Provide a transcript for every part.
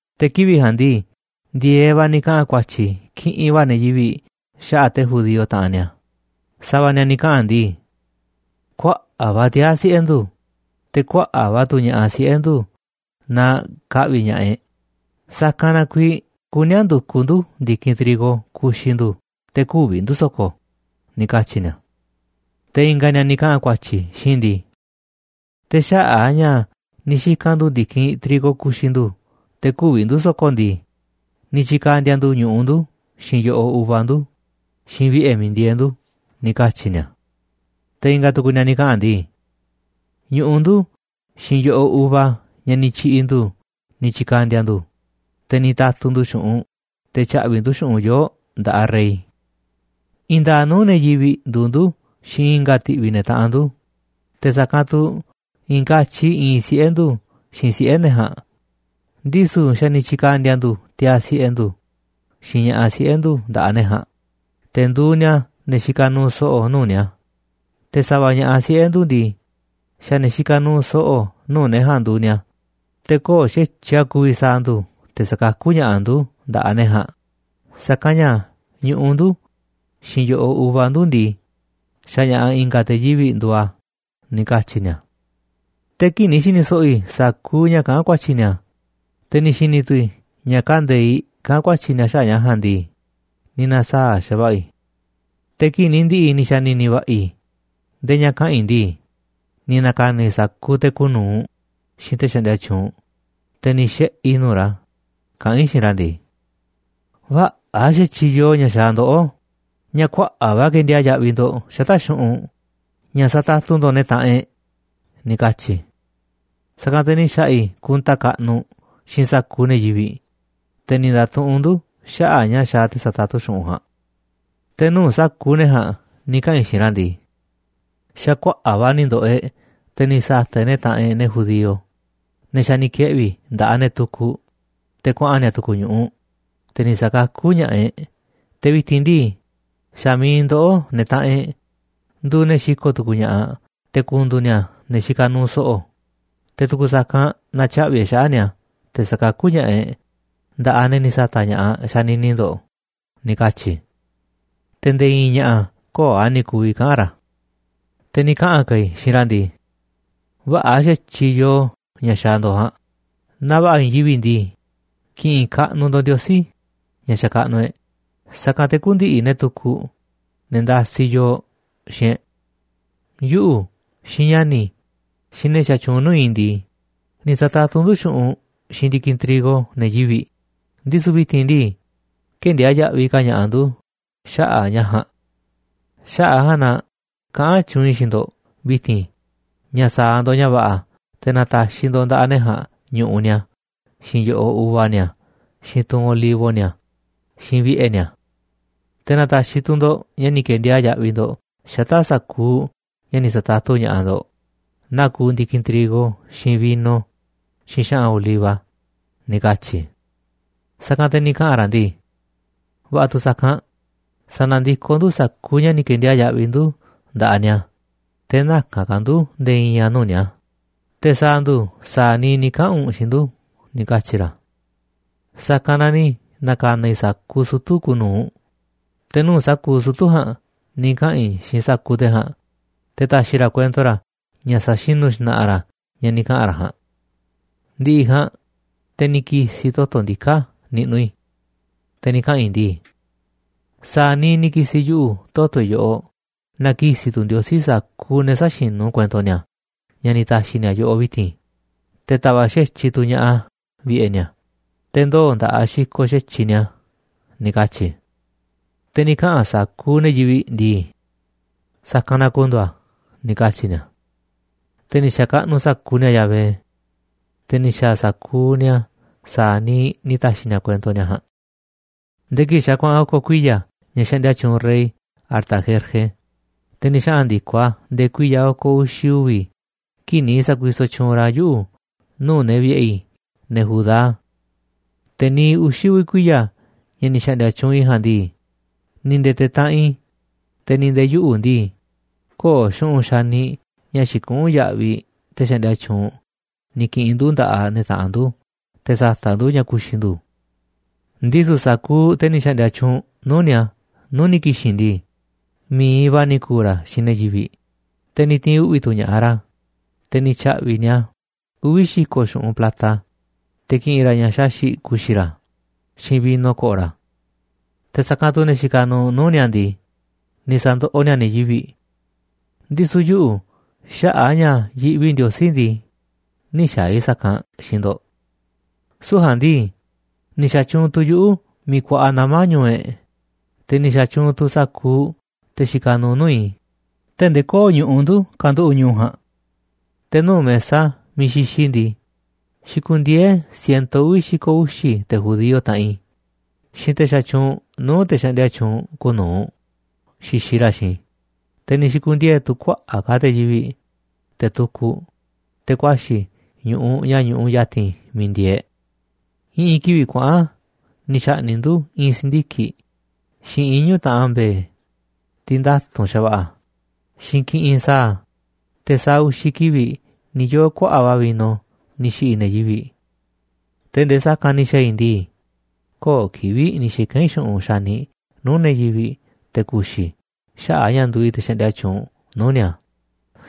Te̱ kivi̱ꞌ ja̱a̱nꞌ ndii, ndi̱e̱eꞌ va̱ ni̱ kaꞌa̱n ku̱a̱tyi̱ kiꞌinꞌ va̱ ne̱ yivi̱ꞌ xaꞌa̱ꞌ te̱ judío, taꞌanꞌ ni̱a̱, Sa̱va̱ ni̱a̱ ni̱ kaꞌa̱n ndii: ―Kuaꞌa̱ꞌ va̱ tiaa̱ siꞌe̱ ndu̱, te̱ kuaꞌa̱ꞌ va̱ tu̱ ña̱ꞌaꞌ siꞌe̱ ndu̱ naaꞌ ka̱ꞌvi̱ ña̱ꞌaꞌ e̱ꞌ, sa̱kanꞌ na kuiiꞌ kuní a̱ ndu̱kuꞌ ndu̱ ndi̱kinꞌ trigo ku̱xi̱ ndu̱ te̱ kü̱vi̱ ndu̱ so̱ko̱ ―ni̱ katyi̱ ni̱a̱. Te̱ i̱nga̱ ni̱a̱ ni̱ kaꞌa̱n ku̱a̱tyi̱ xiinꞌ i̱ ndii: ―Te̱ xaꞌa̱ꞌ a̱ ña̱ ni̱ xika̱n ndu̱ ndi̱kinꞌ trigo ku̱xi̱ ndu̱ te̱ kü̱vi̱ ndu̱ so̱ko̱ ndii, ni̱ tyi̱ka̱ndi̱a̱ ndu̱ ñu̱ꞌuꞌ ndu̱, xiinꞌ yo̱ꞌoꞌ uva ndu̱, xiinꞌ vi̱ꞌe̱ miiꞌ ndieeꞌ ndu̱ ―ni̱ katyi̱ ni̱a̱. Te̱ i̱nga̱ tu̱ku̱ ni̱a̱ ni̱ kaꞌa̱n ndii: ―Ñu̱ꞌuꞌ ndu̱ xiinꞌ yo̱ꞌoꞌ uva ña̱ ni̱ tyi̱ꞌi̱ ndu̱ ni̱ tyi̱ka̱ndi̱a̱ ndu̱, te̱ ni̱ ta̱tu̱ ndu̱ xu̱ꞌunꞌ te̱ tya̱ꞌvi̱ꞌ ndu̱ xu̱ꞌunꞌ yoo̱ꞌ nda̱ꞌaꞌ rey. I̱i̱n nda̱a̱ꞌ nuu̱ꞌ ne̱ yivi̱ꞌ nduuꞌ ndu̱ xiinꞌ i̱nga̱ ti̱ꞌvi̱ ne̱ taꞌanꞌ ndu̱, te̱ sa̱kanꞌ tu̱ i̱i̱n katyi iinꞌ siꞌe̱ ndu̱ xiinꞌ siꞌe̱ ne̱ ja̱a̱nꞌ, ndisu̱ xa̱ ni̱ tyi̱ka̱ndi̱a̱ ndu̱ tiaa̱ siꞌe̱ ndu̱ xiinꞌ ña̱ꞌaꞌ siꞌe̱ ndu̱ nda̱ꞌaꞌ ne̱ ja̱a̱nꞌ te̱ nduuꞌ ni̱a̱ ne̱ xikaꞌ nuuꞌ so̱ꞌo̱ nuu̱ꞌ ni̱a̱, te̱ sa̱va̱ ña̱ꞌaꞌ siꞌe̱ ndu̱ ndii, xa̱ ne̱ xikaꞌ nuuꞌ so̱ꞌo̱ nuu̱ꞌ ne̱ ja̱a̱nꞌ nduuꞌ ni̱a̱. Te̱ köo̱ꞌ xa̱tyiꞌ a̱ ku̱vi̱ sa̱a̱ ndu̱ te̱ sa̱kakú ña̱ꞌaꞌ ndu̱ nda̱ꞌaꞌ ne̱ ja̱a̱nꞌ, sa̱kanꞌ ña̱ ñu̱ꞌuꞌ ndu̱ xiinꞌ yo̱ꞌoꞌ uva ndu̱ ndii, xa̱ ña̱ꞌa̱ i̱nga̱ te̱ yivi̱ꞌ nduuꞌ a̱ ―ni̱ katyi̱ ni̱a̱. Te̱ kii̱ꞌ ni̱ xi̱ni̱ so̱ꞌo̱ i̱ sa̱kuuꞌ ña̱ kaꞌán ku̱a̱tyi̱ ni̱a̱, te̱ ni̱ xi̱ni̱ tu̱ i̱ ña̱ kande̱iꞌ kaꞌán ku̱a̱tyi̱ ni̱a̱ xaꞌa̱ꞌ ña̱ ja̱a̱nꞌ ndii, ni̱ na̱saa̱ꞌ xa̱va̱ꞌa̱ i̱. Te̱ kii̱ꞌ ni̱ ndi̱ꞌi̱ ni̱ xa̱ni̱ni̱ va̱ꞌa̱ i̱ ndee ña̱ kaꞌa̱n i̱ ndii, ni̱ na̱ka̱na̱ i̱ sa̱kuuꞌ te̱ kuuꞌ nu̱uꞌ xiinꞌ te̱ xaꞌndia tyuunꞌ, te̱ ni̱ xiꞌe̱ i̱ nuu̱ꞌ ra̱ kaꞌán i̱ xiinꞌ ra̱ ndii: ―Vä̱ꞌa̱ xa̱tyiꞌ yoo ña̱ xaaꞌ ndoꞌó ña̱ kuaꞌa̱ꞌ va̱ kendiaa̱ꞌ yaꞌviꞌ ndo̱ꞌ xata̱ꞌ xu̱ꞌunꞌ ña̱ satatu ndo̱ꞌ ne̱ taꞌanꞌ e̱ꞌ ―ni̱ katyi̱ i̱. Sa̱kanꞌ te̱ ni̱ xa̱ꞌa̱ i̱ kunta kaꞌnuꞌ xiinꞌ sa̱kuuꞌ ne̱ yivi̱ꞌ, te̱ ni̱ nda̱tuꞌunꞌ ndu̱ xaꞌa̱ꞌ ña̱ xaaꞌ te̱ satatu xu̱ꞌunꞌ ja̱a̱nꞌ. Te̱ nuu̱ꞌ sa̱kuuꞌ ne̱ ja̱a̱nꞌ ni̱ kaꞌa̱n i̱ xiinꞌ ra̱ ndii: ―Xa̱ kuaꞌa̱ꞌ va̱ ni̱ ndo̱ꞌo̱ e̱ꞌ te̱ ni̱ sa̱ta̱ꞌ e̱ꞌ ne̱ taꞌanꞌ e̱ꞌ, ne̱ judío, ne̱ xa̱ ni̱ keꞌvi̱ nda̱ꞌaꞌ ne̱ tukuꞌ te̱ kuaꞌa̱n ni̱a̱ tu̱ku̱ ñu̱ꞌuꞌ, te̱ ni̱ sa̱kakú ña̱ꞌaꞌ e̱ꞌ. Te̱ vi̱ti̱n ndii, xa̱ mi̱iꞌ ndoꞌó, ne̱ taꞌanꞌ e̱ꞌ, nduuꞌ ne̱ xiko̱ꞌ tu̱ku̱u̱ ña̱ꞌaꞌ te̱ ku̱ndu̱u̱ ni̱a̱ ne̱ xikaꞌ nuuꞌ so̱ꞌo̱, te̱ tu̱ku̱ sa̱kanꞌ na̱tyaꞌvi̱ e̱ꞌ xaꞌa̱ꞌ ni̱a̱ te̱ sa̱kakú ña̱ꞌaꞌ e̱ꞌ nda̱ꞌaꞌ ne̱ ni̱ sa̱ta̱ꞌ ña̱ꞌaꞌ xanini ndo̱ꞌ ―ni̱ katyi̱ i̱. Te̱ nde̱e̱ i̱i̱n ña̱ꞌa̱ köo̱ꞌ a̱ ni̱ ku̱vi̱ kaꞌa̱n ra̱. Te̱ ni̱ kaꞌa̱n ka̱ i̱ xiinꞌ ra̱ ndii: ―Vä̱ꞌa̱ xa̱tyiꞌ yoo ña̱ xaaꞌ ndo̱ꞌ ja̱a̱nꞌ, naaꞌ va̱ꞌa̱ i̱i̱n yivi̱ꞌ ndii, ki̱ꞌi̱n kaꞌnuꞌ ndo̱ꞌ Ndiosí, ña̱ xakaꞌnuꞌ e̱ꞌ, sa̱kanꞌ te̱ kü̱ndi̱ꞌi̱ ne̱ tukuꞌ, ne̱ ndasiꞌ yooꞌ, xiinꞌ e̱ꞌ. Yuꞌu̱, xiinꞌ ña̱ni̱ i̱, xiinꞌ ne̱ xatyuunꞌ nuu̱ꞌ i̱ ndii, ni̱ sa̱tatu ndu̱ xu̱ꞌunꞌ xiinꞌ ndi̱kinꞌ trigo ne̱ yivi̱ꞌ, ndisu̱ vi̱ti̱n ndii, kë̱ndiaa̱ꞌ yaꞌviꞌ ka̱ ña̱ꞌaꞌ ndu̱ xaꞌa̱ꞌ ña̱ ja̱a̱nꞌ. Xaꞌa̱ꞌ a̱ ja̱a̱nꞌ na kaꞌán tyuunꞌ i̱ xiinꞌ ndo̱ꞌ vi̱ti̱n ña̱ sa̱a̱ ndo̱ꞌ ña̱ va̱ꞌa̱ te̱ na̱ta̱xi̱ ndo̱ꞌ nda̱ꞌaꞌ ne̱ ja̱a̱nꞌ ñu̱ꞌuꞌ ni̱a̱, xiinꞌ yo̱ꞌoꞌ uva ni̱a̱, xiinꞌ tunꞌ olivo ni̱a̱, xiinꞌ vi̱ꞌe̱ ni̱a̱. Te̱ na̱ta̱xi̱ tu̱ ndo̱ꞌ ña̱ ni̱ ke̱ndiaa̱ꞌ yaꞌviꞌ ndo̱ꞌ xata̱ꞌ sa̱kuuꞌ ña̱ ni̱ sa̱tatu ña̱ꞌaꞌ ndo̱ꞌ, naa kuuꞌ ndi̱kinꞌ trigo, xiinꞌ vino, xiinꞌ xa̱ꞌa̱n oliva ―ni̱ katyi̱ i̱. Sa̱kanꞌ te̱ ni̱ kaꞌa̱n ra̱ ndii: ―Va̱ꞌa̱ tu̱ sa̱kanꞌ, sa̱na̱ndikoꞌ ndu̱ sa̱kuuꞌ ña̱ ni̱ ke̱ndiaa̱ꞌ yaꞌviꞌ ndu̱ nda̱ꞌaꞌ ni̱a̱, te̱ näka̱n ka̱ ndu̱ nde̱e̱ i̱i̱n a̱ nuu̱ꞌ ni̱a̱, te̱ sa̱a̱ ndu̱ sa̱a̱ niiꞌ ni̱ kaꞌa̱n u̱nꞌ xiinꞌ ndu̱ ―ni̱ katyi̱ ra̱. Sa̱kanꞌ na ni̱ na̱ka̱na̱ i̱ sa̱kuuꞌ sutu̱ kuuꞌ nu̱uꞌ, te̱ nuu̱ꞌ sutu̱ ja̱a̱nꞌ ni̱ kaꞌa̱n i̱ xiinꞌ sa̱kuuꞌ te̱ ja̱a̱nꞌ te̱ ta̱xi̱ ra̱ kuento ra̱ ña̱ sa̱xinu̱ xna̱ꞌa̱ ra̱ ña̱ ni̱ kaꞌa̱n ra̱ ja̱a̱nꞌ. Ndi̱ꞌi̱ ja̱a̱nꞌ, te̱ ni̱ ki̱si̱ i̱ toto̱ ndiká niꞌnuꞌ i̱, te̱ ni̱ kaꞌa̱n i̱ ndii: ―Sa̱a̱ niiꞌ ni̱ ki̱si̱ yuꞌu̱ toto̱ i̱ yoꞌoꞌ na ki̱si̱ tu̱ Ndiosí sa̱kuuꞌ ne̱ sä̱xinu̱ kuento ni̱a̱ ña̱ ni̱ ta̱xi̱ ni̱a̱ yoꞌoꞌ vi̱ti̱n, te̱ ta̱va̱ꞌ xa̱tyiꞌ tu̱ ña̱ꞌaꞌ a̱ vi̱ꞌe̱ ni̱a̱, te̱ ndoo̱ nda̱ꞌaꞌ xikoꞌ xa̱tyiꞌ ni̱a̱ ―ni̱ katyi̱ i̱. Te̱ ni̱ kaꞌa̱n sa̱kuuꞌ ne̱ yivi̱ꞌ ndii: ―Sa̱kanꞌ na ku̱ndu̱u̱ a̱ ―ni̱ katyi̱ ni̱a̱. Te̱ ni̱ xa̱kaꞌnuꞌ sa̱kuuꞌ ni̱a̱ Yahvé. Te̱ ni̱ xa̱a̱ sa̱kuuꞌ ni̱a̱ sa̱a̱ niiꞌ ni̱ ta̱xi̱ ni̱a̱ kuento ni̱a̱ ja̱a̱nꞌ. Nde̱e̱ kii̱ꞌ xa̱ kuaꞌa̱n oko̱ kuiya̱ ña̱ xaꞌndia tyuunꞌ rey Artajerjes, te̱ ni̱ xaꞌa̱n ndi̱koꞌ a̱ nde̱e̱ kuiya̱ oko̱ uxi̱ uvi̱ kii̱ꞌ ni̱ sa̱kuisoꞌ tyuunꞌ ra̱ yuꞌu̱ nuu̱ꞌ ne̱ vi̱ꞌe̱ i̱, ne̱ Judá. Te̱ niiꞌ uxi̱ uvi̱ kuiya̱ ña̱ ni̱ xa̱ꞌndi̱a̱ tyuunꞌ i̱ ja̱a̱nꞌ ndii, ni̱ nde̱e̱ te̱ taꞌanꞌ i̱, te̱ ni̱ nde̱e̱ yuꞌu̱ ndii, köo̱ꞌ xu̱ꞌunꞌ xaniꞌ ña̱ xikuꞌún yaꞌviꞌ te̱ xaꞌndia tyuunꞌ, ni̱ ki̱ꞌi̱n ndu nda̱ꞌaꞌ ne̱ taꞌanꞌ ndu̱ te̱ sa̱ta̱ꞌ ndu̱ ña̱ ku̱xi̱ ndu̱. Ndisu̱ sa̱kuuꞌ te̱ ni̱ xa̱ꞌndi̱a̱ tyuunꞌ nuu̱ꞌ ni̱a̱ nuu̱ꞌ ni̱ ki̱xi̱n ndii, mi̱iꞌ va̱ ni̱ ku̱u̱ ra̱ xiinꞌ ne̱ yivi̱ꞌ, te̱ ni̱ ti̱i̱n uꞌvi̱ tu̱ ña̱ꞌaꞌ ra̱, te̱ ni̱ tya̱ꞌvi̱ꞌ ni̱a̱ uvi̱ xi̱ko̱ xu̱ꞌunꞌ plata te̱ ki̱ꞌi̱n ra̱ ña̱ xaxi̱ꞌ ku̱xi̱ ra̱, xiinꞌ vino ko̱ꞌo̱ ra̱. Te̱ sa̱kanꞌ tu̱ ne̱ xikaꞌ nuuꞌ nuu̱ꞌ ni̱a̱ ndii, ni̱ sa̱ndoꞌoꞌ ni̱a̱ ne̱ yivi̱ꞌ. Ndisu̱ yuꞌu̱, xaꞌa̱ꞌ a̱ ña̱ yiꞌvi i̱ Ndiosí ndii, nï̱ xa̱a̱ i̱ sa̱kanꞌ xiinꞌ ndo̱ꞌ. Süu̱ꞌ ja̱a̱nꞌ ndii, ni̱ xa̱tyuunꞌ tu̱ yuꞌu̱ miiꞌ kuaꞌa nama̱ ñu̱u̱ e̱ꞌ, te̱ ni̱ xa̱tyuunꞌ tu̱ sa̱kuuꞌ te̱ xikaꞌ nuuꞌ nuu̱ꞌ i̱, tee̱ꞌ ndee köo̱ꞌ ñu̱ꞌuꞌ ndu̱ kanduꞌu̱ꞌ ñu̱u̱ ja̱a̱nꞌ. Te̱ nuu̱ꞌ mesa miiꞌ xixiꞌ i̱ ndii, xikundieé siento uvi̱ xi̱ko̱ uxi̱ te̱ judío, taꞌanꞌ i̱, xiinꞌ te̱ xatyuunꞌ nuu̱ꞌ te̱ xaꞌndia tyuunꞌ kuuꞌ nu̱uꞌ xixiꞌ ra̱ xiinꞌ i̱, te̱ ni̱ xi̱ku̱ndiee̱ tu̱ kuaꞌa̱ꞌ ka̱ te̱ yivi̱ꞌ, te̱ tukuꞌ, te̱ ku̱a̱xi̱ ñu̱ꞌuꞌ ña̱ ñuꞌuꞌ ya̱ti̱n miiꞌ ndieeꞌ e̱ꞌ. I̱ꞌi̱n kivi̱ꞌ kuaꞌa̱n ni̱ xa̱ꞌni̱ꞌ ndu̱ i̱i̱n si̱ndiki̱ꞌ, xiinꞌ iñu̱ taꞌan mbe̱e̱, tiꞌ nda̱tu̱nꞌ xa̱va̱ꞌa̱, xiinꞌ kiꞌinꞌ sa̱a̱, te̱ sa̱a̱ uxi̱ kivi̱ꞌ ni̱ yoo̱ kuaꞌa̱ꞌ va̱ vino ni̱ xi̱ꞌi̱ ne̱ yivi̱ꞌ. Tee̱ꞌ ndee sa̱kanꞌ ni̱ xa̱a̱ i̱ ndii, köo̱ꞌ kivi̱ꞌ ni̱ xika̱n i̱ xu̱ꞌunꞌ xaniꞌ nuu̱ꞌ ne̱ yivi̱ꞌ te̱ kuxi̱ i̱ xaꞌa̱ꞌ a̱ ña̱ nduuꞌ i̱ te̱ xaꞌndia tyuunꞌ nuu̱ꞌ ni̱a̱,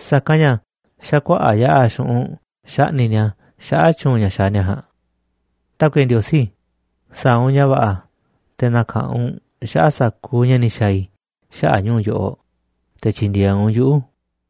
sa̱kanꞌ ña̱ xa̱ kuaꞌa̱ꞌ yaꞌa̱ xu̱ꞌunꞌ xaꞌni̱ꞌ ni̱a̱ xaꞌa̱ꞌ tyu̱u̱n ña̱ xaaꞌ ni̱a̱ ja̱a̱nꞌ. Tákuiꞌe Ndiosí, sa̱a̱ u̱nꞌ ña̱ va̱ꞌa̱ te̱ na̱ka̱ꞌanꞌ u̱nꞌ xaꞌa̱ꞌ sa̱kuuꞌ ña̱ ni̱ xa̱a̱ i̱ xaꞌa̱ꞌ ñu̱u̱ yoꞌoꞌ, te̱ tyi̱ndi̱e̱eꞌ u̱nꞌ yuꞌu̱.